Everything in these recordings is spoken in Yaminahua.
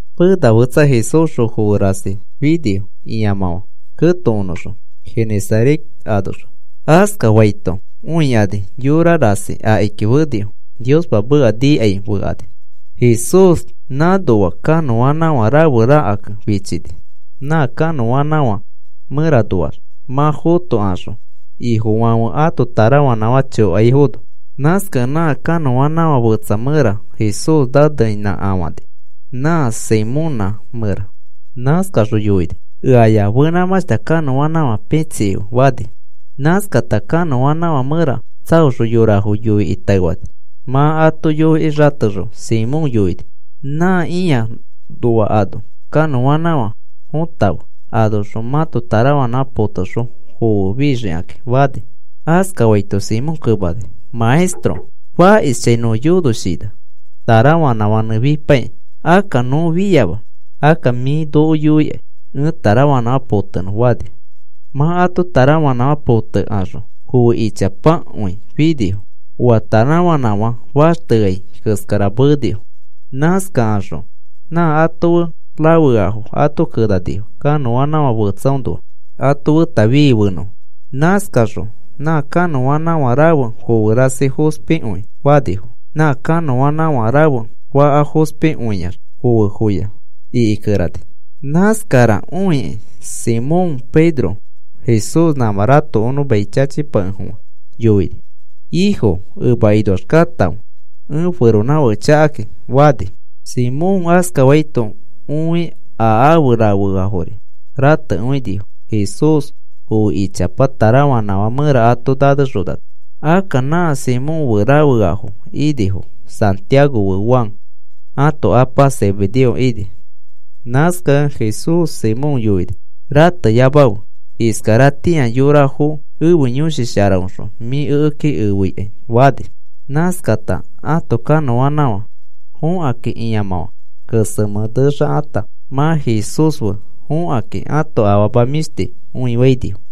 Pena fetsa Jesúsxõ foe rasi finifo ĩamãfã ketokonõxõ Genesaret anoxõ. Askafaito õikani yora rasi akiki fenifo. Niospa meka niakai fekani. Jesús nãnoa kanõanãfã rafe rakakẽ fichini, nã kanõanãfã mẽranoax mã fotokaxõ ifofãfe ato tarafanãfã chokaifono. Nãskakẽ nã kanõanãfã fetsa mẽra Jesús naneinãkafani, nã Simonã mẽra. Nãskaxõ yoini: “Eaya fenãmãshta kanõanãfã pitsikife,” fani. Nãskata kanõanãfã mẽra tsaoxõ yorafo yoikĩ taefani. Mã ato yoikĩ xatexõ Simón yoini: “Nã ĩa noa ano kanõanãfã fotakãfe. Anoxõ mãto tarafanãfã potaxõ foe fixikakĩ,” fani. Askafaito Simón kemani: “Maestro, fakishchãi nõ yonoshina tarafanãfãnẽ fipaikĩ. Akka nõ fiama. Akka mĩ noko yoikai ẽ tarafanãfã potenõ,” fani. Mã ãto tarafanãfã potekaxõ foe ichapakõi finifo. Oa tarafanãfã faxteai keskara meenifo. Nãskakaxõ nã ato fe rafeafo ato kenanifo, kanõanãfã fetsaõnoa, ato feta fii fenõfo. Nãskakaxõ nã kanõanãfã rafe foe rasi fospikõi faafono nã kanõanãfã rafe faka fospikõiax foefoya ikikerani. Nãskara õikĩ Simón Pedro Jesús nãmã ratokonõ mai chachipakefofã yoini: “Ifo, emakinoax katãfe, ẽ feronãfake chakakĩ,” fani. Simón askaito õi a ãfe rafeafori ratekõinifo Jesús foe ichapa tarafanãfã mẽra ato nanexonano. Akka nã Simón fe rafeafo inifo, Santiago fe Juan ãto apa Zebedeo ini. Nãskakẽ Jesús Simón yoini: “Rateyamafe. Iskaratĩa yorafo ẽfe Yõshi Sharaõxõ mĩ ekeki efeikai,” fani. Nãskakata ãto kanõanãfã fõkata ĩamãfã kesemẽ nexakata mã Jesús fe fõkakĩ ãto afama mĩshti õifainifo.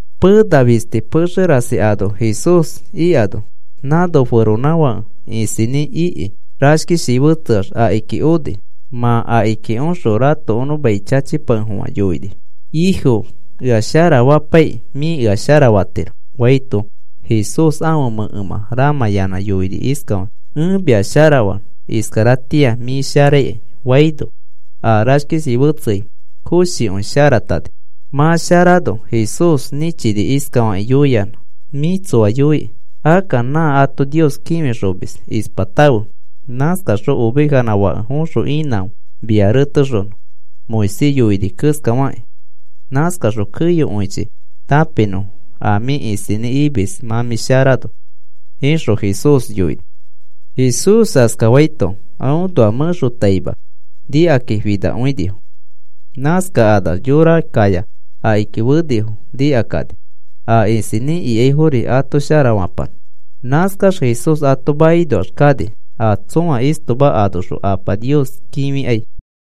Pena fisti pexe rasi ano Jesús ikano nãno feronãfake isinĩ iki rashkishi fetseax akiki oni. Mã akiki oxõ ratokonõ mai chachipakefofã yoini: “Ifo, ea sharafapaikĩ mĩ ea sharafatiro,” faito, Jesús ãfe mẽkemã ramãyanã yoini iskafakĩ: “Ẽ mia sharafanõ. Iskaratĩa mĩ sharaikai,” faino a rashkishi fetseai koshikõi sharatani. Mã sharano Jesús nĩchini iskafakĩ yoiyanã: “Mĩ tsoa yoiki. Akka nã ato Nios kĩfixomis ispatãfe. Nãskaxõ ovejanã fake foxõ inãfe mia retexonõ Moisés yoini keskafakĩ. Nãskaxõ keyokõichi tãpinõfo a mĩ isinĩ imis mã mĩ sharano,” ixõ Jesús yoini. Jesús askafaito aõnoa mẽxotaima nikakĩ finakõinifo. Nãskakanax yora kaya akiki fenifo nikakani, a isinĩ ikaifori ato sharafapanõ. Nãskax Jesús ato makinoax kani, a tsõa istoma anoxõ Apa Nios kĩfikai.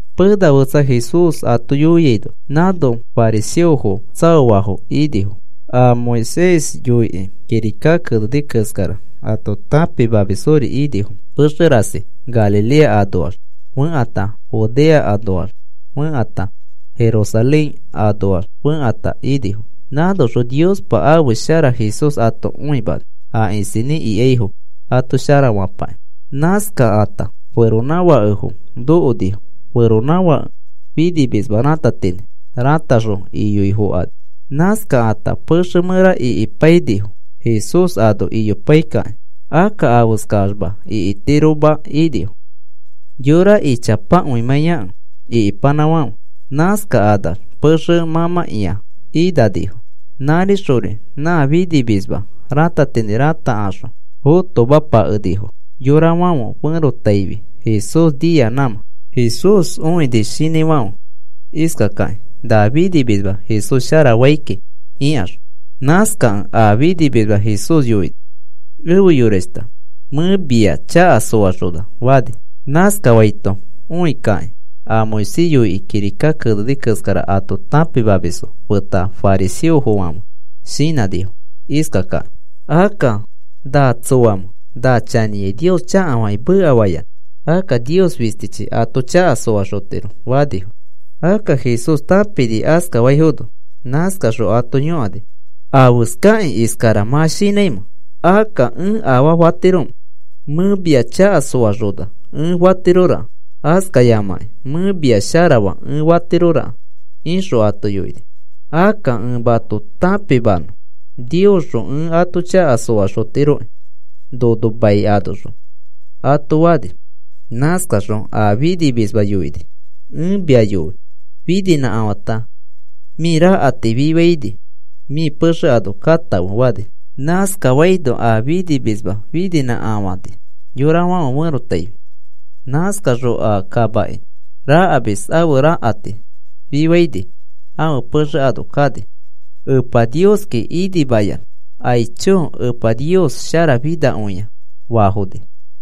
Pena fetsa Jesús ato yoiaino nãno fariseofo tsaoafo inifo. A Moisés yoikĩ kirika keneni keskara ato tãpimamisfori inifo. Pexe rasi Galilea anoax fekãta Judea anoax fẽkata Jerusalén anoax fẽkata inifo. Nãnoxõ Niospa ãfe shara Jesús ato õimani, a isinĩ ikaifo ato sharafapakĩ. Nãskakata feronãfakefo nokonifo. Feronãfake finimisma ratatinĩ rataxõ iyoifokani. Nãskakata pexe mẽra ikimapainifo, Jesús ano iyopaikakĩ. Akka afeskaxma ikitiroma inifo, yorafo ichapakõimãiyakẽ ikipanãfãfe. Nãskakanax pexe fomãkĩa inanifo. Nãrixõ nã finimisma ratatinĩ ratakaxõ fotomapakefofãnifo, yorafãfe ferotaifi Jesús nia nãmã. Jesús õini shinãifãfe iskakakĩ na finimisma Jesús sharafai kiki ikaxõ. Nãskakẽ a finimisma Jesús yoini: “Efe yorashta, mẽ mia chaka soaxona,” fani. Nãskafaito õikakĩ, a Moisés yoikĩ kirika keneni keskara ato tãpimamisfo feta fariseofãfe shinãnifo iskakakĩ: “Akka, ¿na tsoamẽ na chanĩai Nios chakafakĩ mekafayanã? Akka Nios fistichi ato chaka soaxotiro,” fanifo. Akka Jesús tãpini askafaifono. Nãskaxõ ato yõkani: “¿Afeskakĩ iskara mã shinãimẽ? Akka, ¿ẽ afaa fatiromẽ? Mẽ mia chaka soaxona ẽ fatiroraka, askayamakĩ mẽ mia sharafaa ẽ fatiroraka,” ixõ ato yoini. “Akka ẽ mato tãpimanõ Niosxõ ẽ ato chaka soaxotiroki nono mai anoxõ,” ato fani. Nãskaxõ a finimisma yoini: “Ẽ mia yoi, fininĩkafãta mĩ rakati fifaini mĩ pexe ano katãfe,” fani. Nãskafaino a finimisma fininãkafani yorafãfe ferotaifi. Nãskaxõ a kamaki rakamis ãfe rakati fifaini ãfe pexe ano kani. Epa Nioski inimayanã. “Aicho, Epa Nios sharafinakõia,” faafoni.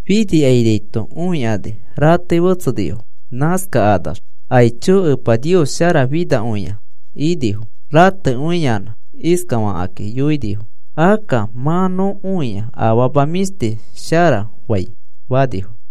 Finikainaito õikani ratei fetsenifo. Nãskakanax, “¡Aicho, Epa Nios sharafinakõia!” inifo. Ratekõiyanã iskafakĩ yoinifo: “Akka mã nõ õi afama mĩshti shara fai,” fanifo.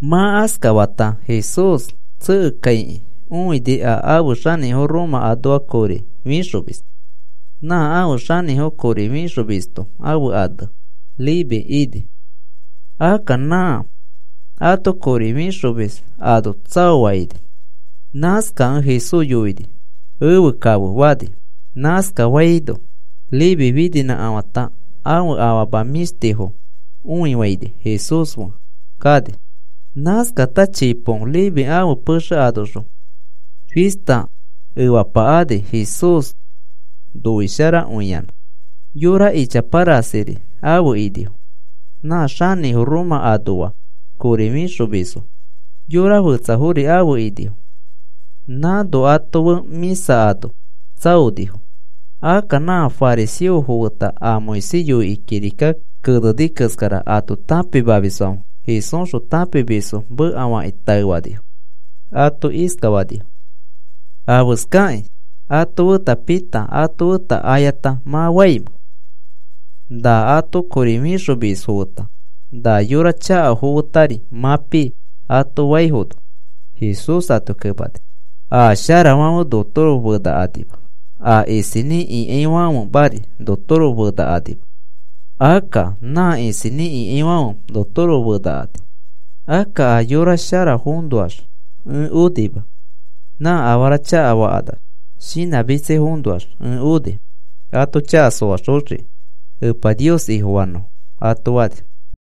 Mã askafata Jesús tsekekaikĩ õini, a ãfe xanĩfo Roma anoa kori fixomis. Nã ãfe xanĩfo kori fixomisto ãfe ane Leví ini. Akka nã ato kori fixomis ano tsaoa ini. Nãskakẽ Jesús yoini: “Efe kafe,” fani. Nãskafaino Leví fininãkafãta ãfe afama mĩshtifo õifaini Jesús fe kani. Nãskata chipo Leví ãfe pexe anoxõ fista efapa ani Jesús noisharakõiyanã. Yora ichapa rasiri afe inifo. Nã xanĩfo Roma anoa kori fixomisfo. Yora fetsafori afe inifo. Nãno ato fe mĩsa ano tsaonifo. Akka nã fariseofo feta a Moisés yoikĩ kirika keneni keskara ato tãpimamisfãfe Jesúsxõ tãpimisfo mekafakĩ taefanifo. Ato iskafanifo: “¿Afeskakĩ ato feta pita ato feta ayata mã faimẽ? Na ato kori fixomisfo feta na yora chakafo fetari mã pii,” ato faifono, Jesús ato kemani: “A sharafãfe notoro fenakanima, a isinĩ ikaifãfemari notoro fenakanima. Akka nã isinĩ ikaifãfe notoro fenakani. Akka a yora sharafoõnoax ẽ onima. Nã afara chakafakanax shinãmitsaifoõnoax ẽ oni, ato chaka soaxoxiki Epa Nios Ifofanõfo,” ato fani.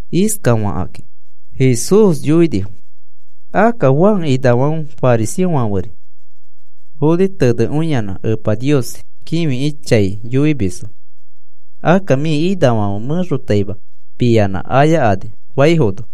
Iskafakĩ Jesús yoinifo: “Akka Juan inafãfe, fariseofãferi foni tenekõiyanã Epa Nios kĩfikĩ chai yoimisfo. Akka mĩ inafãfe mẽxotaima piyanã ayakani,” faifono,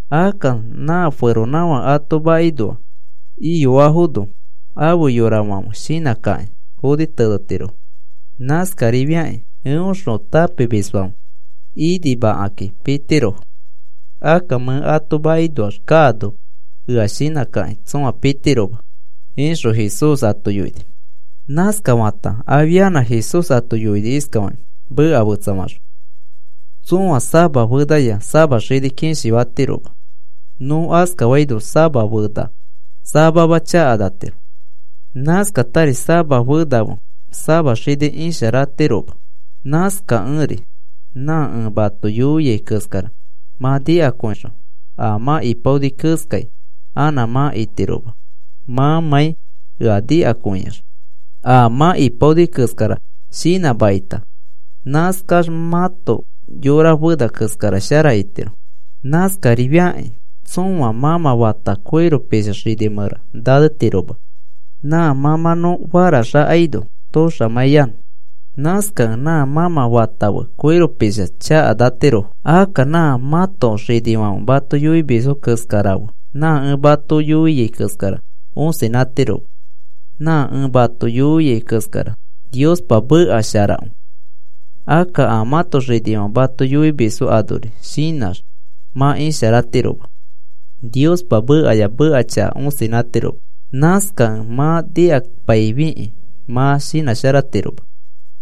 Akka nã feronãfake ato makinoa iyoafono ãfe yorafãfe shinãkakĩ foni tenetirofo. Nãskarifiakĩ eõxõ tãpimisfãfe inimakakĩ pitirofo. Akka mẽ ato makinoax kaano ea shinãkakĩ tsõa pitiroma,” ixõ Jesús ato yoini. Nãskafata afianã Jesús ato yoini iskafakĩ, meka fetsafaxõ: “Tsõa sama fenaya sama xini kishi fatiroma. Nõ askafaino sama fena samama chakanatiro. Nãskatari sama fena fe sama xini isharatiroma. Nãskakẽri nã ẽ mato yoiai keskara mã nikakõixõ a mã ipaoni keskai anã mã itiroma mãmãi ea nikakõiax. A mã ipaoni keskara shinãmakita nãskax mãto yora fena keskara shara itiro. Nãskarifakĩ tsõa mãmã fata koiro pisha xini mẽra nanetiroma nã mãmãnõ farax akaino toxamãiyanõ. Nãskakẽ nã mãmã fata fe koiro pisha chakanatirofo. Akka nã mãto xinifãfe mato yoimisfo keskara fe nã ẽ mato yoiai keskara osinãtiroma. Nã ẽ mato yoiai keskara Niospa meka sharakõi. Akka a mãto xinifãfe mato yoimisfo anori shinãx mã isharatiroma. Niospa mekaya meka chaka osinãtiroma. Nãskakẽ mã nikapaifikĩ mã shinãsharatiroma.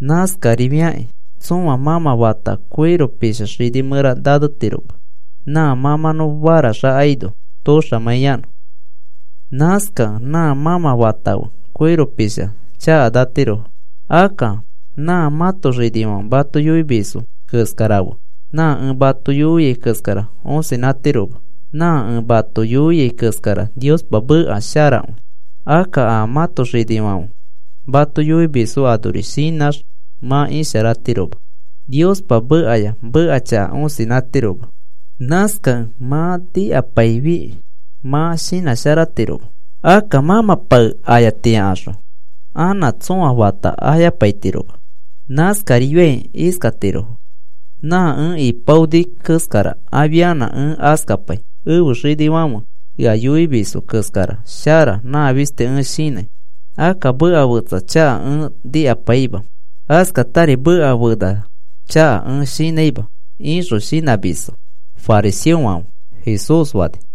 Nãskarifakĩ tsõa mãmã fata koiro pisha xini mẽra nanetiroma nã mãmãnõ farax akaino toxamãiyanõ. Nãskakẽ nã mãmã fata fe koiro pisha chakanatirofo. Akka nã mãto xinifãfe mato yoimisfo keskara fe nã ẽ mato yoiai keskara osinãtiroma. Nã ẽ mato yoiai keskara Niospa meka sharakõi. Akka a mãto xinifãfe mato yoimisfo anori shinãx mã isharatiroma. Niospa mekaya meka chaka osinãtiroma. Nãskakẽ mã nikapaifikĩ mã shinãsharatiroma. Akka mãmã pae ayatiakaxõ anã tsõa fata ayapaitiroma. Nãskariai iskatirofo: ‘Nã ẽ ipaoni keskara afianã ẽ askapai, ẽfe xinifãfe ea yoimisfo keskara shara nã fisti ẽ shinãi. Akka meka fetsa chaka ẽ nikapaima. Askatari meka fena chaka ẽ shinãima,’ ixõ shinãmisfo fariseofãfe,” Jesús fani.